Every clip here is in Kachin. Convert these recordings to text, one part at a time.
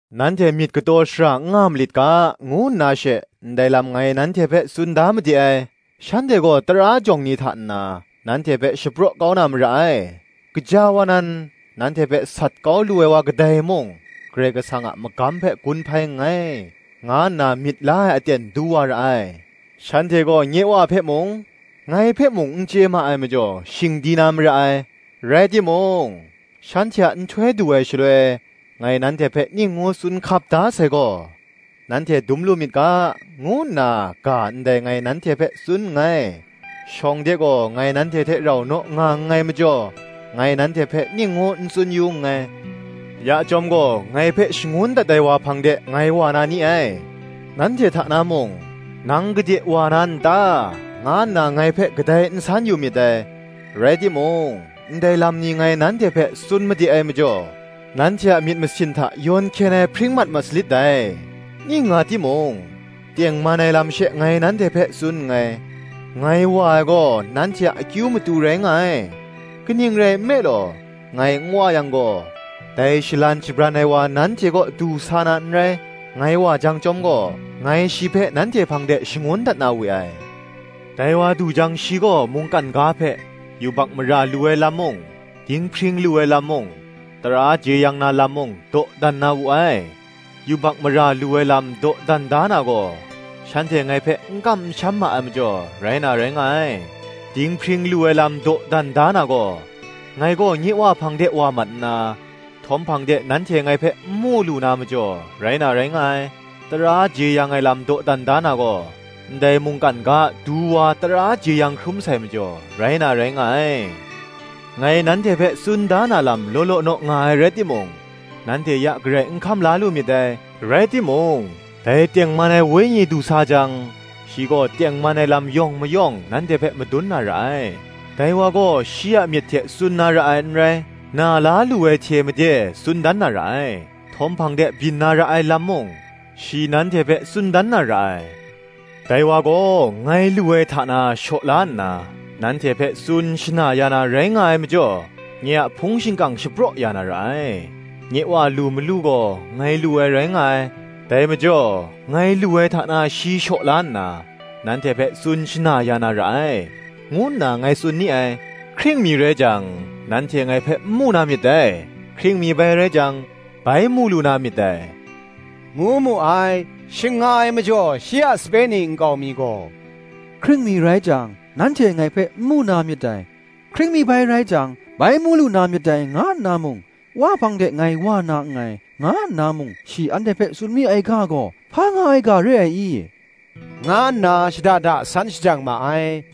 “Nanhte myit kataw shara n nga malit ga, ngu nna she, ndai lam ngai nanhte hpe tsun da made ai. Shanhte gaw tara jawng ni hta nna, nanhte hpe shapraw kau na mara ai: gaja wa nan, nanhte hpe sat kau lu ai wa kadai mung, Karai Kasang a magam hpe gun hpai nngai, nga nna myit la ai aten du wa ra ai. Shanhte gaw nye Wa hpe mung, ngai hpe mung n chye ma ai majaw, shing di na mara ai. Rai timung, shanhte a nhtoi du ai shaloi, ngai nanhte hpe ning ngu tsun hkap da sai gaw, nanhte dum lu myit ga, ngu nna ga ndai ngai nanhte hpe tsun nngai: shawng de gaw ngai nanhte hte rau naw nga nngai majaw, ngai nanhte hpe ning ngu n tsun yu nngai. “Ya chyawm gaw, ngai hpe shangun dat ai wa hpang de ngai wa na ni ai: nanhte hta na mung, ‘Nang gade wa na n ta?’ nga nna ngai hpe kadai n san yu myit dai. Rai timung, ndai lam ni ngai nanhte hpe tsun made ai majaw, nanhte a myit masin hta yawn hkyen ai hpring mat ma salit dai. Ning nga timung, tengman ai lam she ngai nanhte hpe tsun nngai: ngai wa ai gaw nanhte a akyu matu rai nga ai: kaning rai nme law, ngai n wa yang gaw, dai Shalan Shabran ai wa nanhte kaw du sa na n rai: ngai wa jang chyawm gaw, ngai shi hpe nanhte hpang de shangun dat na we ai. Dai wa du jang shi gaw mungkan ga hpe, yubak mara lu ai lam mung, dinghpring lu ai lam mung, tara jeyang na lam mung, dawdan da na wu ai: yubak mara lu ai lam dawdan da na gaw, shanhte ngai hpe n kam n sham ma ai majaw, rai na rai nga ai: dinghpring lu ai lam dawdan da na gaw, ngai gaw nye Wa hpang de wa mat nna, htawm hpang de nanhte ngai hpe n mu lu na majaw, rai na rai nga ai; tara jeyang ai lam dawdan da na gaw, ndai mungkan ga a Du wa tara jeyang hkrum sai majaw, rai na rai nga ai. Ngai nanhte hpe tsun da na lam law law naw nga ai rai timung, nanhte ya garai n hkam la lu myit dai. Rai timung, dai tengman ai Wenyi du sa jang, shi gaw tengman ai lam yawng mayawng nanhte hpe madun na ra ai: dai wa gaw shi a myit hte tsun na ra ai n rai; na la lu ai hte made tsun dan na ra ai: htawm hpang de byin na ra ai lam mung, shi nanhte hpe tsun dan na ra ai. Dai wa gaw, ngai lu ai hta na shaw la nna, nanhte hpe tsun shana ya na rai nga ai majaw, nye a hpung shingkang shapraw ya na ra ai. Nye Wa lu malu gaw ngai lu ai rai nga ai: dai majaw, ngai lu ai hta na shi shaw la nna, nanhte hpe tsun shana ya na ra ai,” ngu nna ngai tsun ni ai. “Hkring mi rai jang, nanhte ngai hpe n mu na myit dai; hkring mi bai rai jang, bai mu lu na myit dai,” ngu mu ai. Shing nga ai majaw shi a sape ni nkau mi gaw, “Hkring mi rai jang, nanhte ngai hpe n mu na myit dai; hkring mi bai rai jang, bai mu lu na myit dai,” nga nna mung, “Wa hpang de ngai wa na nngai, nga nna mung, shi anhte hpe tsun mi ai ga gaw, hpa nga ai ga re ai i?” nga nna shada da san shajang ma ai: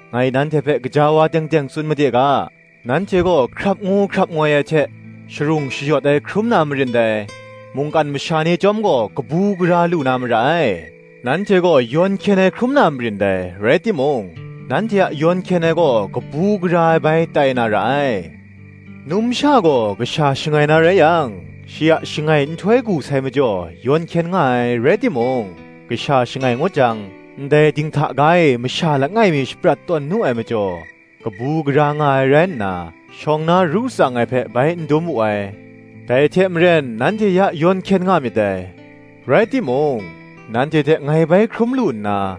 Ngai nanhte hpe gaja wa teng teng tsun made ga, “Nanhte gaw hkrap ngu hkrap ngoi ai hte, sharung shayawt ai hkrum na marin dai; mungkan masha ni chyawm gaw kabu gara lu na mara ai; nanhte gaw yawn hkyen ai hkrum na marin dai, rai timung, nanhte a yawn hkyen ai gaw kabu gara ai bai tai na ra ai. Numsha gaw kasha shangai na rai yang, shi a shangai nhtoi gu sai majaw, yawn hkyen nga ai, rai timung, kasha shangai ngut jang, ndai dinghta ga e masha langai mi shaprat tawn nu ai majaw, kabu gara nga ai rai nna, shawng na ru tsang ai hpe bai n dum wu ai. Dai hte maren nanhte ya yawn hkyen nga myit dai: rai timung, nanhte hte ngai bai hkrum lu nna,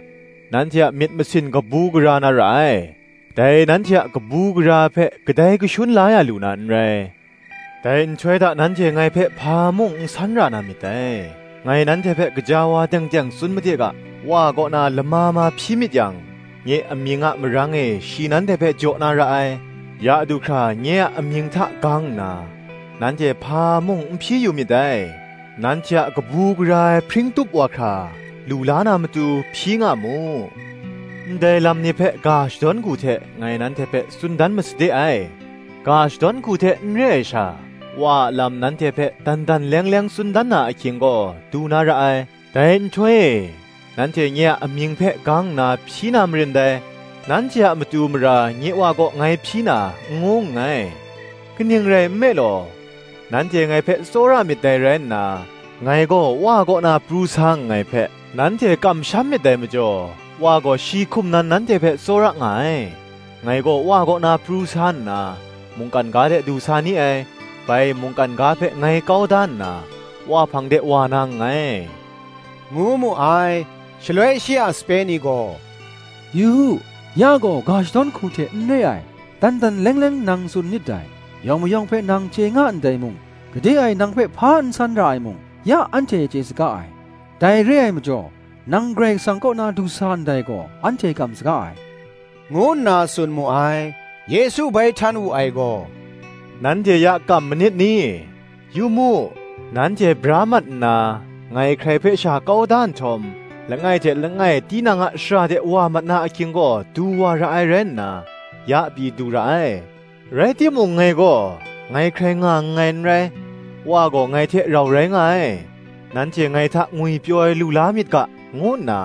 nanhte a myit masin kabu gara na ra ai: dai nanhte a kabu gara ai hpe kadai kashun la ya lu na n rai. Dai nhtoi hta nanhte ngai hpe hpa mung n san ra na myit dai: ngai nanhte hpe gaja wa teng teng tsun made ga, Wa kaw na lama ma hpyi myit yang, nye amying a marang e shi nanhte hpe jaw na ra ai. Ya du hkra nye a amying hta gang nna, nanhte hpa mung n hpyi yu myit dai: nanhte a kabu gara ai hpring tup wa hkra, lu la na matu, hpyi nga mu. “Ndai lam ni hpe ga shadawn hku hte ngai nanhte hpe tsun dan masade ai; ga shadawn hku hte n re ai sha, Wa a lam nanhte hpe dan dan leng leng tsun dan na ahkying gaw, du na ra ai. Dai nhtoi e, nanhte nye a amying hpe gang nna hpyi na marin dai; nanhte a matu mara nye Wa kaw ngai hpyi na, n ngu nngai: kaning rai nme law, nanhte ngai hpe tsawra myit dai rai nna, ngai gaw Wa kaw na pru sa nngai hpe, nanhte kamsham myit dai majaw, Wa gaw shi hkum nan nanhte hpe tsawra nga ai. Ngai gaw Wa kaw na pru sa nna, mungkan ga de du sa ni ai; bai mungkan ga hpe ngai kau da nna, Wa hpang de wa na nngai,” ngu mu ai. Shaloi shi a sape ni gaw, “Yu u, ya gaw ga shadawn hku hte n re ai, dan dan leng leng nang tsun nit dai: yawng mayawng hpe nang chye nga ndai mung, gade e nang hpe hpa n san ra ai mung, ya anhte chye saga ai: dai re ai majaw nang Karai Kasang kaw na du sa ndai gaw, anhte kam saga ai,” ngu nna tsun mu ai. Yesu bai htan wu ai gaw, “Nanhte ya kam manit ni? Yu mu, nanhte bra mat nna, ngai hkrai hpe sha kau da nhtawm, langai hte langai tinang a shara de wa mat na ahkying gaw du wa ra ai rai nna, ya pyi du ra ai: rai timung ngai gaw, ngai hkrai nga nngai n rai, Wa gaw ngai hte rau rai nga ai. Nanhte ngai hta ngwipyaw ai lu la myit ga, ngu nna,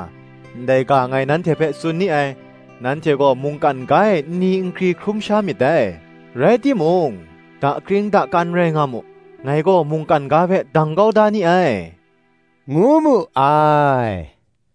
ndai ga ngai nanhte hpe tsun ni ai: nanhte gaw mungkan ga e nni nkri hkrum sha myit dai: rai timung, dakring dakan rai nga mu; ngai gaw mungkan ga hpe dang kau da ni ai, ngu mu ai.